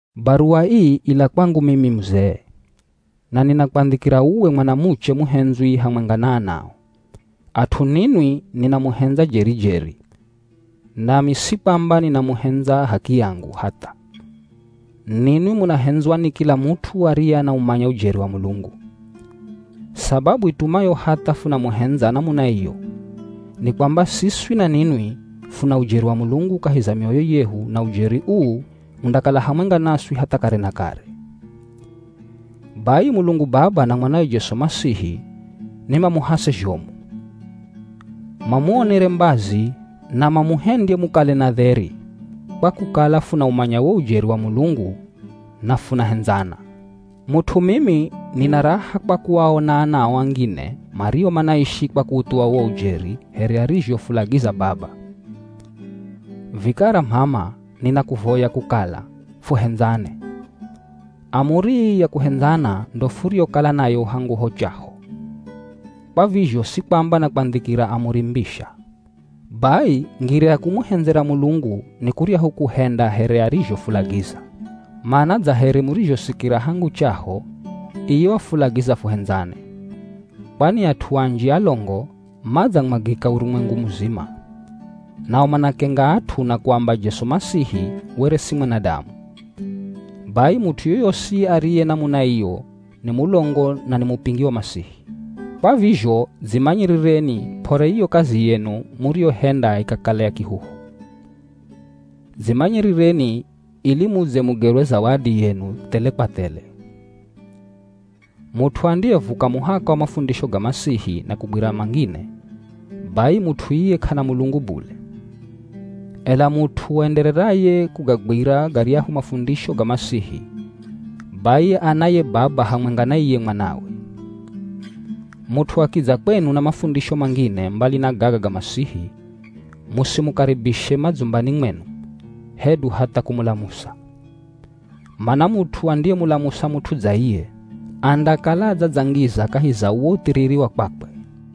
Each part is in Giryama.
Baruwa ii ila kwangu mimi muzee. Na ninakwandhikira uwe mwanamuche muhendzwi hamwenga na anao. At'u ninwi ninamuhendza jeri-jeri, nami si kwamba ninamuhendza h'akiyangu, hatha. Ninwi munahendzwa ni kila mut'u ariye anaumanya ujeri wa Mulungu. Sababu itumayo hatha funamuhendza namuna iyo, ni kwamba siswi na ninwi, funa ujeri wa Mulungu kahi za mioyo yehu na ujeri uu undakala hamwenga naswi hatha kare na kare. Bai Mulungu Baba na mwanawe Jesu Masihi ni mamuhase zhomu, mamuonere mbazi na mamuhendye mukale na dheri, kwa kukala funaumanya wo ujeri wa Mulungu na funahendzana. Mut'u mimi nina raha kwa kuaona anao angine mario manaishi kwa kuuthuwa wo ujeri here arizhofulagiza Baba. Vikara m'ama ninakuvoya kukala fuhendzane. Amuri ii ya kuhendzana ndo furiyokala nayo hangu ho chaho, kwa vizho si kwamba nakwandhikira amuri mbisha. Bai ngira ya kumuhendzera Mulungu ni kuryahu kuhenda here arizhofulagiza. Mana dza here murizhosikira hangu chaho, iye wafulagiza fuhendzane. Kwani at'u anji alongo madzamwagika urumwengu muzima. Nao manakenga at'u na kuamba Jesu Masihi were si mwanadamu. Bai mut'u yoyosi ariye namuna iyo ni mulongo na ni mupingi wa Masihi. Kwa vizho dzimanyirireni p'ore iyo kazi yenu muriyohenda ikakala ya kihuhu. Dzimanyirireni ili mudze mugerwe zawadi yenu thele kwa thele. Mut'u andiyevuka muhaka wa mafundisho ga Masihi na kugwira mangine, bai mut'u iye k'ana Mulungu bule. Ela mut'u aendereraye kugagwira garyahu mafundisho ga Masihi, bai ana ye Baba hamwenga na iye Mwanawe. Mut'u akidza kwenu na mafundisho mangine mbali na gaga ga Masihi, musimukaribishe madzumbani mwenu hedu hatha kumulamusa. Mana mut'u andiyemulamusa mut'u dza iye, andakala adzadzangiza kahi za uwo uthiriri wa kwakwe.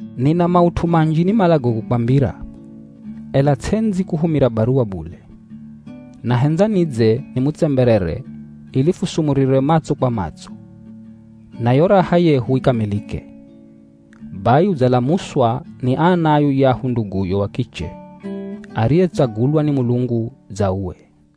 Nina maut'u manji nimalago kukwambira, ela ts'endzi kuhumira baruwa bule. Nahendza nidze nimutsemberere ili fusumurire matso kwa matso, na yo raha yehu ikamilike. Bai udzalamuswa ni ana a yuyahu nduguyo wa kiche, ariyetsagulwa ni Mulungu dza uwe.